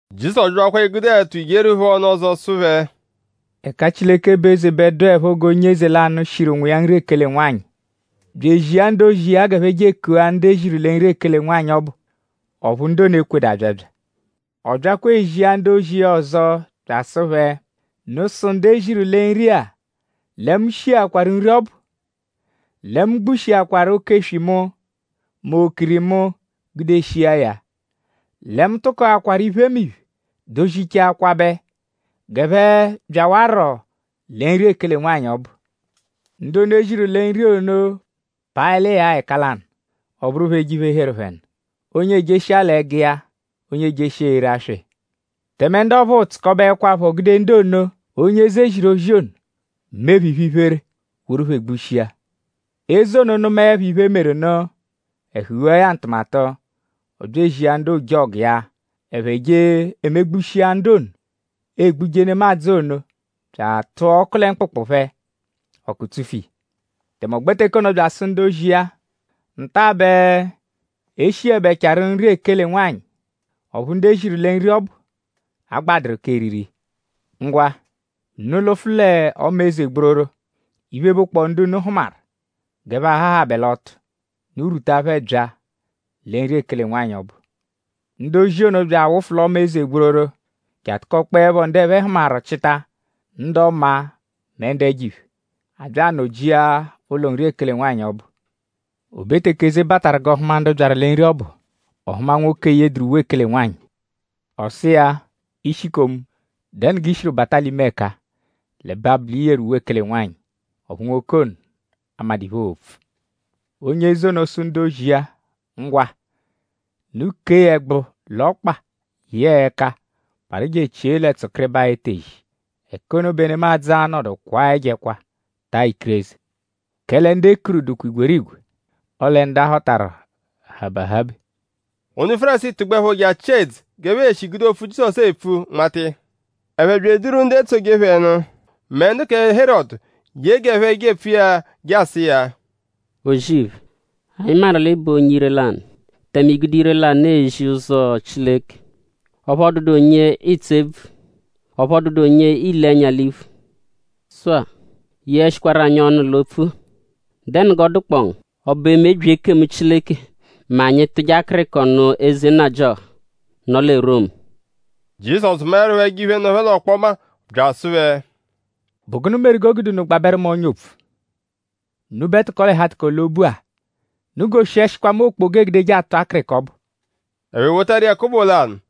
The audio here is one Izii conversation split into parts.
Jizọsu byakwa egude ẹtu yeeru phẹ ọnu ọzo sụ phẹ: “Ẹka Chileke bụ eze bẹ dụepho g'onye eze lanụ, shiru nwa iya nri ekele nwanyị; bya ezia ndu-ozi iya g'ẹphe je ekua ndu e ziru lẹ nri ekele nwanyị ọbu; ọphu ndu ono ekwedu abyabya. Ọ byakwa ezia ndu-ozi iya ọzo bya asụ phẹ: ‘Unu sụ ndu e ziru lẹ nri-a lẹ mu shiakwaru nri ọbu; lẹ mu gbushikwaru oke-eswi mu; mẹ okiri mu gude shia ya; lẹ mu tụkoakwaru iphemiphe dozichaa kwabẹ; g'ẹphe byawarọ lẹ nri ekele nwanyị ọbu.’ Ndu ono, e ziru lẹ nri ono paẹl'iya-a ẹka lanụ; ọ bụru phẹ eje iphe, heru phẹ nụ. Onye ejeshia l'ẹgu iya; onye ejeshia ere aswa iya. Tẹme ndu ọphuu tsụkobeekwapho gude ndu ono, onye eze ziru ozi ono mee phẹ iphe-iphere woru phẹ gbushia. Eze ono nụmaepho iphe, meru nụ; ẹhu ghua ya ntụmatu. Ọ bya ezia ndu ojọgu iya; ẹphe je emegbushia ndu ono egbuje nemadzụ ono bya atụa ọku lẹ mkpụkpu phẹ; ọku tsufu iya. Tẹme ọ gbẹ teke ono bya asụ ndu-ozi iya: ‘Nta bẹ e shiẹbechaaru nri ekele nwanyị; ọphu ndu e ziru lẹ nri ọbu agbadụru k'eriri iya. Ngwa; unu lụfu l'ọma eze gbororo; iphe, bụkpoo ndu unu hụmaru g'ẹphe ahahabẹ l'ọtu; unu rwuta phẹ bya lẹ nri ekele nwanyị ọbu.’ Ndu ozi ono bya awụfu l'ọma eze gbororo je atụkokpoepho ndu ẹphe hụmaru chịta; ndu ọma mẹ ndu ẹjo-iphe. A bya anọ-jia ụlo nri ekele nwanyị ọbu. “O be teke eze bataru g'ọ hụma ndu byaru lẹ nri ọbu; ọ hụma nwoke, eyeduru uwe ekele nwanyị. Ọ sụ iya: ‘Ishikomu;?dẹnu g'i shiru bata l'ime ẹka-a; l'ẹbe abụ l'i yeru uwe ekele nwanyị?’ Ọphu nwoke ono amadụ iphe, oo-pfu. Onye eze ono sụ ndu-ozi iya: ‘Ngwa; unu kee ya ẹgbu l'ọkpa yẹe ẹka parụ je echie lẹ tsụkiribaa etezi. Ẹka ono bẹ nemadzụ a-nọdu kwaa ẹjo ẹkwa; taa ikireze.’” “Kẹle ndu e kuru dụkwa igwerigwe; ọle ndu a họtaru habe ahabe.” Ndu Fárisii tụgbuepho je achịa idzu g'ẹphe e-shi gude opfu, Jizọsu epfu nmata iya. Ẹphe bya eduru ndu etsoje phẹ nụ mẹ ndu kẹ Herọdu ye g'ẹphe jepfu iya je asụ iya: “O-zì-iphe; anyi maru l'ị bụ onye ire-lanụ; tẹme i gude ire-lanụ ezi ụzo Chileke; ọphu ọ dụdu onye ịitsu ebvu. Ọphu ọ dụdu onye iile ẹnya l'iphu. Sụ-a; yeẹshikwaru anyi ọnu l'opfu-a.?Dẹnu g'ọ dụkpoo ngu??Ọ bụ emebyi ekemu Chileke mẹ anyi -tụje akịriko nụ eze nnajịoha, nọ lẹ Romu?” Jizọsu maẹrupho ẹjo-iphe, nọ phẹ l'ọkpoma bya asụ phẹ: “?Bụ gụnu meru g'o gude unu gbabẹru mu ọ́nyà opfu; unubẹ tụko-l'ẹhu-atụko-l'obu-a? Unu goshiẹshikwa mu okpoga, eegudeje atụ akịriko ọbu.” Ẹphe wotaru iya kobo lanụ.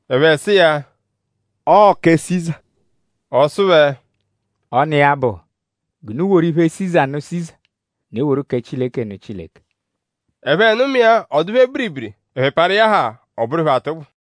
Ẹphe sụ iya: “Ọo kẹ Siza!” Ọ sụ phẹ: “Ọ n'iya-a bụ g'unu woru iphe Siza nụ Siza; unu eworu kẹ Chileke nụ Chileke!” Ẹphe nụma iya; ọ dụ phẹ biribiri. Ẹphe parụ iya haa; ọ bụru phẹ atụgbu.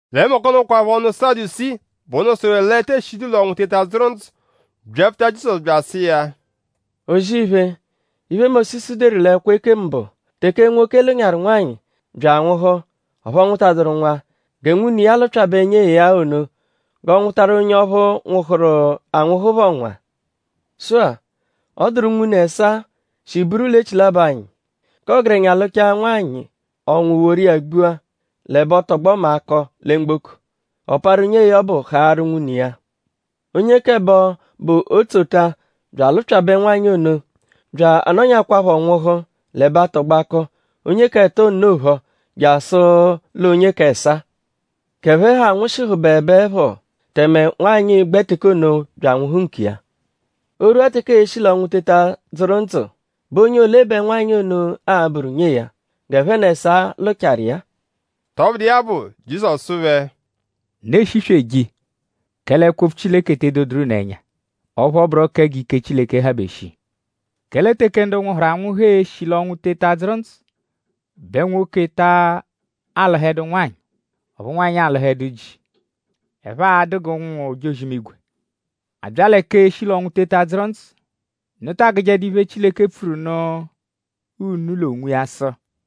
Lẹ mbọku ono kwaphọ ndu Sadusii, bụ ndu sụru l'e tee shidu l'ọnwu eteta adzụru ndzụ; byapfuta Jizọsu bya asụ iya: “O-zì-iphe; iphe, Mósisu deru l'ẹkwo ekemu bụ; teke nwoke lụnyaaru nwanyị bya anwụhu; ọphu ọ nwụtaduru nwa; gẹ nwune iya lụpyabe nyee ya ono g'ọ nwụtaru onye ọphuu, nwụhuru anwụhu phọ nwa. Sụ-a; ọ dụru unwune ẹsaa, shi buru l'echilabọ anyi. K'ọgerenya lụchaa nwanyị; ọnwu woru iya gbua; l'ẹbe ọ tọgbo mẹ akọ lẹ mgboko. Ọ parụ nyee ya ọbu haarụ nwune iya. Onye k'ẹbo, bụ otsota bya alụpyabe nwanyị ono; bya anọnyakwaapho nwụhu; l'ẹbe atọgbo akọ; onye k'ẹto nno phọ; jasụ l'onye k'ẹsaa. G'ẹphe ha nwụshihubebeepho tẹme nwanyị gbẹ teke ono bya anwụhu nkiya. O -rwua teke ee-shi l'ọnwu teta dzụru ndzụ;?bụ onye ole bẹ nwanyị ono a-bụru nyee ya; g'ẹphe n'ẹsaa lụchaaru iya-a?” Tọbudu iya bụ; Jizọsu sụ phẹ: “Unu eshisweje iya; kẹle ẹkwo-opfu Chileke te edoduru unu ẹnya; ọphu ọ bụro kẹ g'ike Chileke habe shii. Kẹle teke ndu nwụhuru anwụhu e-shi l'ọnwu teta dzụru ndzụ bẹ nwoke taa lụhedu nwanyị; ọphu nwanyị alụhedu ji. Ẹphe a-dụ g'ụnwu-ojozi-imigwe. A -bya lẹ k'eshi l'ọnwu teta dzụru ndzụ;?unu ta agụjedu iphe, Chileke pfuru nụ unu l'onwiya sụ: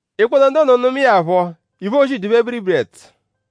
Ikpoto ndu ono nụmae ya phọ; iphe, oozi dụa phẹ biribiri ẹtu.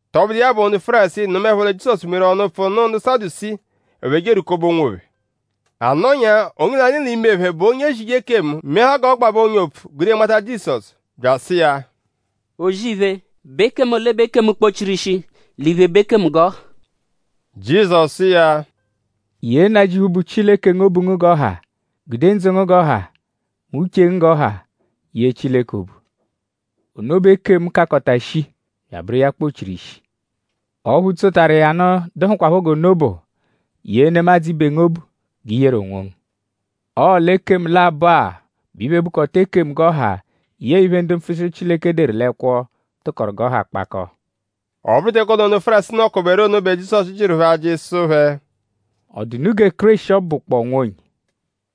Tọbudu iya bụ; ndu Fárisii nụmaepho lẹ Jizọsu mewaru ọnu-pfụu nụ ndu Sadusii; ẹphe je erwukọbe onwophẹ. A nọnyaa; onye lanụ l'ime phẹ, bụ onye ezije ekemu meahaa g'ọ gbabẹ ọ́nyà opfu gude nmata Jizọsu; bya asụ iya: “O-zì-iphe;?bụ ekemu ole bụ ekemu, kpọ-chiru ishi l'iphe, bụ ekemu g'ọ ha?” Jizọsu sụ iya: “ ‘Yee Nnajịuphu, bụ Chileke ngu obu ngu g'ọ ha. Gude ndzụ ngu g'ọ ha; mẹ uche ngu g'ọ ha yee Chileke obu.’ Ono bụ ekemu, kakọta shii bya abụru iya kpọ-chiru ishi. Ọphu tsotaru iya nụ, dụhukwapho g'ono bụ: ‘Yee nemadzụ ibe ngu obu g'i yeru onwongu.’ Ọo l'ekemu labọ-a bẹ iphe, bụkota ekemu g'ọ ha yẹe iphe, ndu mpfuchiru Chileke deru l'ẹkwo tụkoru g'ọ ha kpakọo.” Ọ bụru teke ono, ndu Fárisii nọkoberu ono bẹ Jizọsu jịru phẹ ajị sụ phẹ: “?Ọ dụ unu gẹ Kéreshi ọbu, bụkpoo Nwa onye?”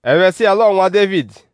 Ẹphe sụ iya l'ọo Nwa Dévidi.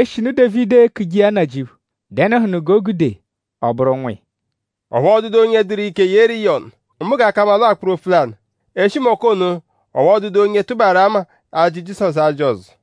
Eshinu Dévidi ekuje iya Nnajịuphu;?dẹnuhunu g'o gude ọ bụru Nwa iya?” Ọphu ọ dụdu onye dụru ike yeeru iya ọnu; mbụ g'ọ ka mma l'ọo akpụru opfu lanụ. Eshi mbọku ono; ọphu ọ dụdu onye tụbaaru ama ajị Jizọsu ajị ọzo.